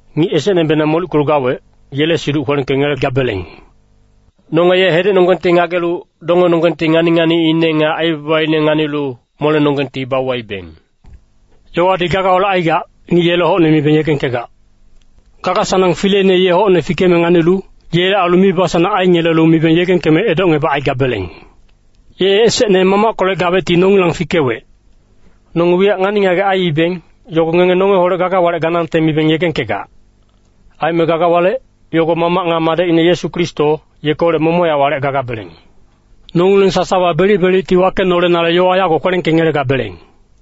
Ngic esecnebenang molickelu gawec, yele siduc kwelengkengelegabeleng. Nonge ye hedecnonggengti ngagelu, dongenonggengti ngani-nganiine nga aibabaine nganilu, molenonggengti bauwaibeng. Yowadi gagaholec aigac, ngic yele hocne mibeng yegengkegac. Gaga-sanang fileine ye hocne fikeme nganilu, yele ailu mibasanang aingelelu mibeng yegengkeme edocngebacaigabeleng. Ye esecne Mamackolec gawecti nongilang fikewec. Nonge wiyac ngani-ngagec aiibeng, yogo ngenge nongeholec gaga walec ganangte mibeng yegengkegac. Aime gaga walec, yogo Mamac nga Madecine Yesu Kristo, yekeholec momochac walec gagabeleng. Nongileng sasawa belic-belicti wakenolenale yowa yago kwelengkengelegabeleng.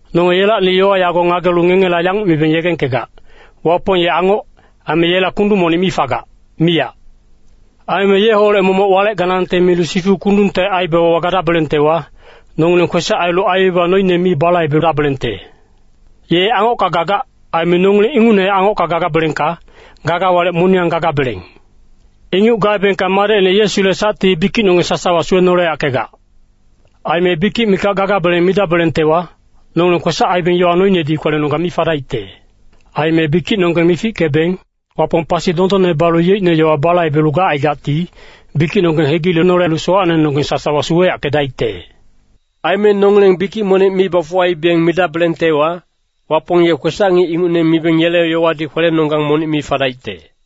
Nonge yelacni yowa yago ngagelu ngengela yanguc mibeng yegengkegac, Wapong ye angoc, aime yela kundung monic mi fagac, miyac. Aime yeholec momoc walec ganangte milu sifu kundungte aibabawa gadabelengtewa, nongileng kwesac ailu aibaba noine mi balaibedabelengte. Ye angocka gagac. Aime nongileng ingucnehac angocka gagabelengka, gaga walec moniyang gagabeleng. Inguc gaebengka madecine Yesule sacti bikicnonggeng sasawa suwenoleyackegac. Aime bikic mikac gagabeleng midabelengtewa, nongileng kwesac aibeng yowa noinedi kwelenonggang mi fadaicte. Aime bikicnonggeng mifickebeng, Wapong pasi dondonne balu yeicne yowa balaibelu gacaigacti, bikicnonggeng hegilenolelu sowacnenonggeng sasawa suweyackedaicte. Aime nongileng bikic monic mi bafuwaibeng midabelengtewa, Wapong ye kwesac-ngic ingucne mibeng yele yowadi kwelenonggang monic mi fadaicte.